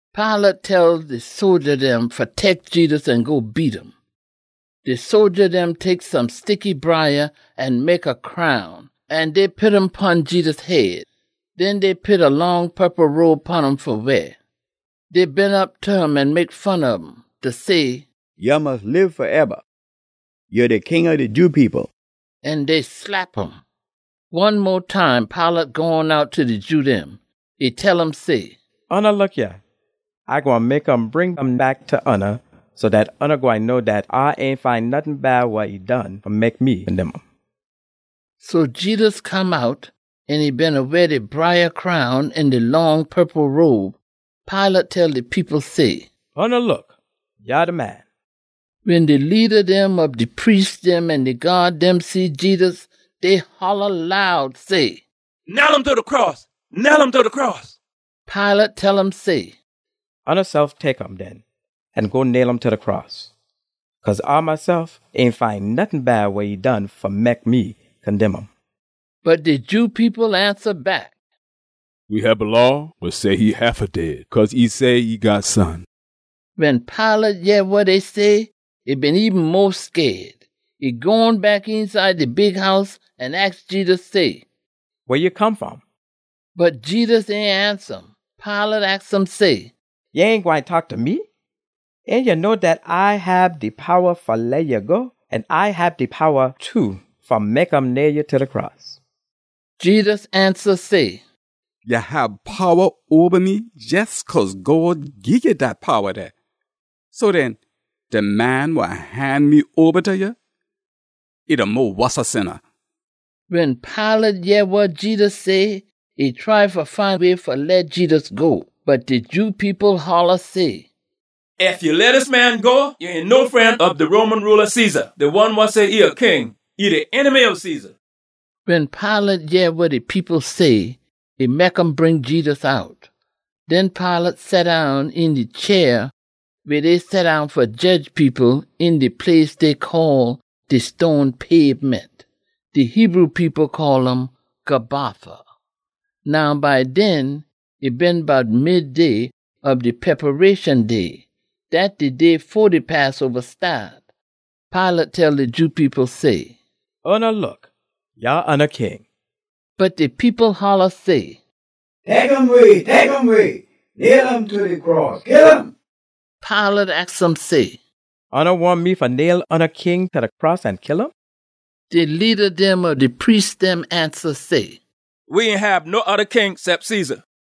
Pilate tell de sodja dem fa tek Jedus an go beat um. De sodja dem tek some sticky briah an mek a crown, an dey pit um pon Jedus head. Den dey pit a long purple robe pon um fa weah. Dey beena op ta um an mek fun ob um, da say, “Ya mus lib faeba, ya de King ob de Jew people!” An dey slap um. One mo time Pilate gone out ta de Jew dem. E tell um say, “Oona look yah, A gwine mek um bring um back ta oona so dat oona gwine know dat A ain find nottin bad wa e done fa mek me condemn um.” So Jedus come out, an e beena weah de briah crown an de long purple robe. Pilate tell de people say, “Oona look! Yah de man!” Wen de leada dem ob de priest dem an de gyaad dem see Jedus, dey holla loud say, “Nail um ta de cross! Nail um ta de cross!” Pilate tell um say, “Oonasef tek um den an go nail um ta de cross. Cause A mesef, A ain find nottin bad wa e done fa mek me condemn um.” Bot de Jew people ansa back, “We hab a law wa say e haffa dead, cause e say e God Son.” Wen Pilate yeh wa dey say, e been eben mo scaid. E gone back eenside de bighouse an aks Jedus say, “Weh ya come fom?” Bot Jedus ain ansa um. Pilate aks um say, “Ya ain gwine taak ta me? Ain ya know dat A hab de powa fa leh ya go, an A hab de powa too fa mek um nail ya ta de cross?” Jedus ansa say, “Ya hab powa oba me jes cause God gii ya dat powa dey. So den, de man wa han me oba ta ya, e de mo wossa sinna.” Wen Pilate yeh wa Jedus say, e try fa find a way fa leh Jedus go. Bot de Jew people holla say, “Ef ya leh dis man yah go, ya ain no fren ob de Roman rula Caesar. De one wa say e a king, e de enemy ob Caesar.” Wen Pilate yeh wa de people say, e mek um bring Jedus out. Den Pilate seddown een de chair weh dey seddown fa jedge people, een de place dey call De Stone Pabement. (De Hebrew people call um Gabbatha.) Now by den, e been bout midday ob de Preparation Day. Dat de day fo de Passoba staat. Pilate tell de Jew people say, “Oona look! Yah oona King!” Bot de people holla say, “Tek um way! Tek um way! Nail um ta de cross. Kill um!” Pilate aks um say, “Oona wahn me fa nail oona king ta de cross an kill um?” De leada dem ob de priest dem ansa say, “We ain hab no oda king cep Caesar!”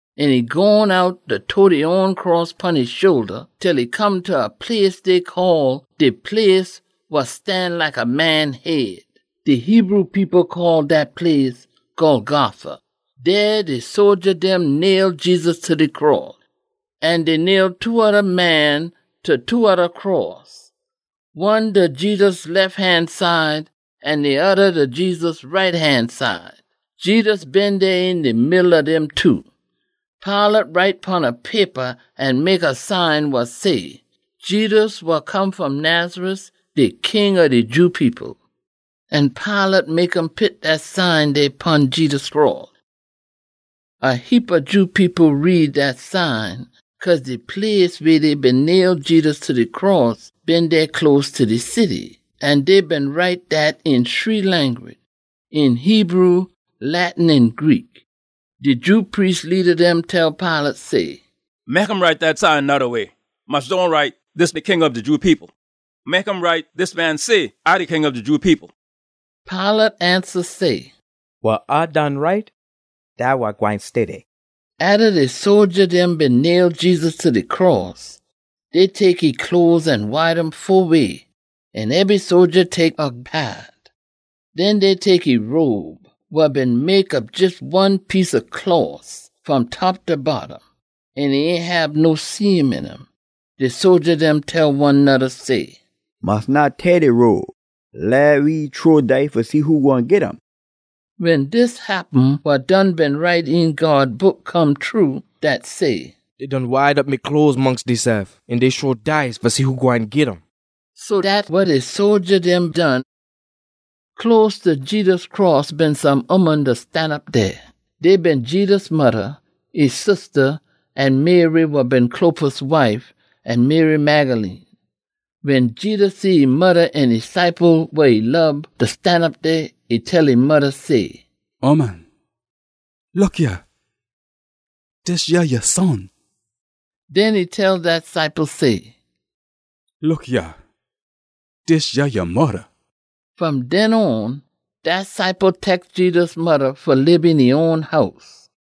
An e gone out, da tote e own cross pon e shoulda, til e come ta a place dey call “De place wa stan like a man head.” (De Hebrew people call dat place “Golgotha.”) Dey, de sodja dem nail Jedus ta de cross. An dey nail two oda man ta two oda cross, one ta Jedus lef han side an de oda ta Jedus right han side. Jedus been dey een de middle ob dem two. Pilate write pon a paper an mek a sign wa say, “Jedus, wa come fom Nazareth, de King ob de Jew People.” An Pilate mek um pit dat sign dey pon Jedus cross. A heapa Jew people read dat sign, cause de place weh dey been nail Jedus ta de cross been dey close ta de city. An dey been write dat een shree language, een Hebrew, Latin an Greek. De Jew priest leada dem tell Pilate say, “Mek um write dat sign noda way. Mus dohn write, ‘Dis de King ob de Jew People.’ Mek um write, ‘Dis man say, A de King ob de Jew People.’” Pilate ansa say, “Wa A done write, dat wa gwine stay dey.” Atta de sodja dem been nail Jedus ta de cross, dey tek e cloes an wide um fo way, an ebry sodja tek a paat. Den dey tek e robe, wa been mek ob jes one piece ob closs fom top ta bottom, an ain hab no seam een um. De sodja dem tell one noda say, “Mus dohn teah de robe. Leh we shrow dice fa see who gwine git um.” Wen dis happen wa done been write een God Book come true. Dat say, “Dey done wide op me cloes mongst deysef, an dey shrow dice fa see who gwine git um.” So dat wa de sodja dem done. Close ta Jedus cross been some ooman da stanop dey. Dey been Jedus modda, e sista, an Mary wa been Clopas wife, an Mary Magdalene. Wen Jedus see e modda an de ciple wa e lob da stanop dey, e tell e modda say, “Ooman, look yah. Dis yah ya son.” Den e tell dat ciple say, “Look yah. Dis yah ya modda.” Fom den on, dat ciple tek Jedus modda fa lib een e own house.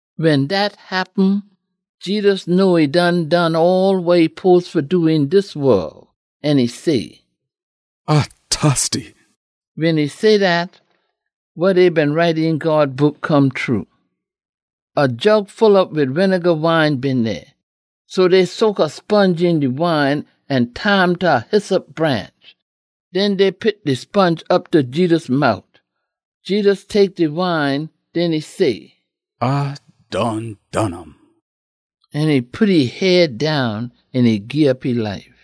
Wen dat happen, Jedus know e done done all wa e spose fa do een dis wol, an e say, “A tosty.” Wen e say dat, wa dey been write een God Book come true. A jug full op wid winega wine been dey, so dey soak a sponge een de wine an tie um ta a hyssop branch. Den dey pit de sponge op ta Jedus mout. Jedus tek de wine. Den e say, “A done done um!” An e pit e head down an e gii op e life.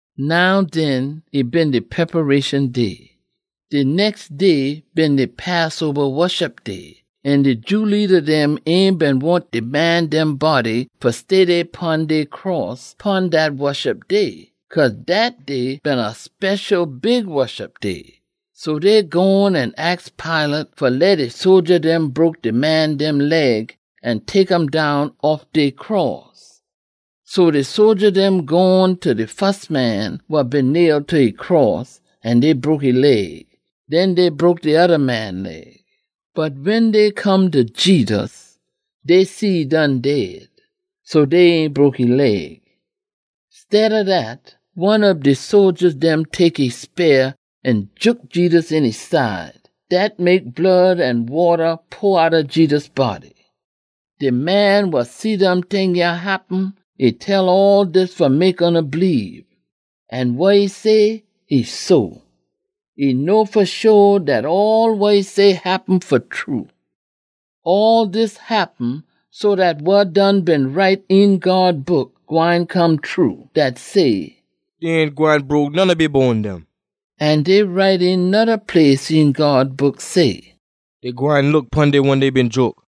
Now den, e been de Preparation Day. De nex day been de Passoba Woshup Day, an de Jew leada dem ain been wahn de man dem body fa stay dey pon dey cross pon dat Woshup Day. Cause dat day been a special big Woshup Day. So dey gone an aks Pilate fa leh de sodja dem broke de man dem leg an tek um down off ob dey cross. So de sodja dem gone ta de fus man wa been nail ta e cross an dey broke e leg. Den dey broke de oda man leg. Bot wen dey come ta Jedus, dey see e done dead, so dey ain broke e leg. Steada dat, one ob de sodja dem tek e speah an jook Jedus een e side. Dat mek blood an wata pour outta Jedus body. (De man wa see dem ting yah happen, e tell all dis fa mek oona bleebe. An wa e say, e so. E know fa sho dat all wa e say happen fa true.) All dis happen so dat wa done been write een God Book gwine come true. Dat say, “Dey ain gwine broke none ob e bone dem.” An dey write een noda place een God Book say, “Dey gwine look pon de one dey been jook.”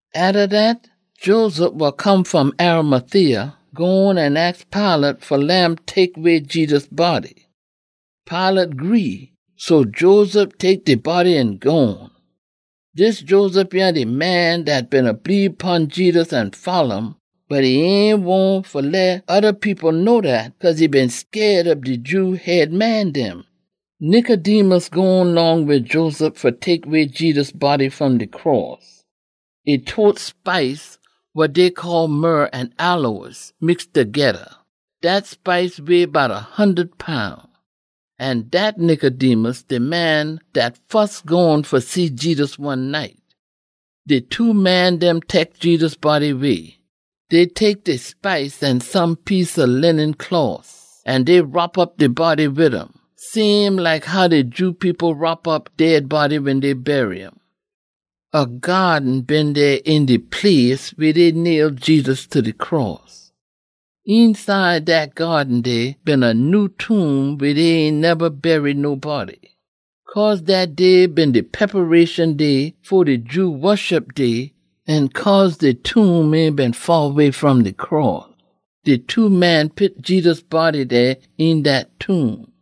Atta dat, Joseph wa come fom Arimathea gone an aks Pilate fa leh um tek way Jedus body. Pilate gree, so Joseph tek de body an gone. (Dis Joseph yah de man dat beena bleebe pon Jedus an folla um, bot e ain wahn fa leh oda people know dat, cause e been scaid ob de Jew head man dem.) Nicodemus gone long wid Joseph fa tek way Jedus body fom de cross. E tote spice wa dey call myrrh an aloes, mix togeda. Dat spice weigh bout a hundud pound. (An dat Nicodemus de man dat fus gone fa see Jedus one night.) De two man dem tek Jedus body way. Dey tek de spice an some piece ob linen closs an dey wrop op de body wid um, same like how de Jew people wrop op dead body wen dey bury um. A gyaaden been dey een de place weh dey nail Jedus ta de cross. Eenside dat gyaaden dey been a nyew tomb weh dey ain neba bury nobody. Cause dat day been de Preparation Day fo de Jew Woshup Day an cause de tomb ain been faa way fom de cross, de two man pit Jedus body dey een dat tomb.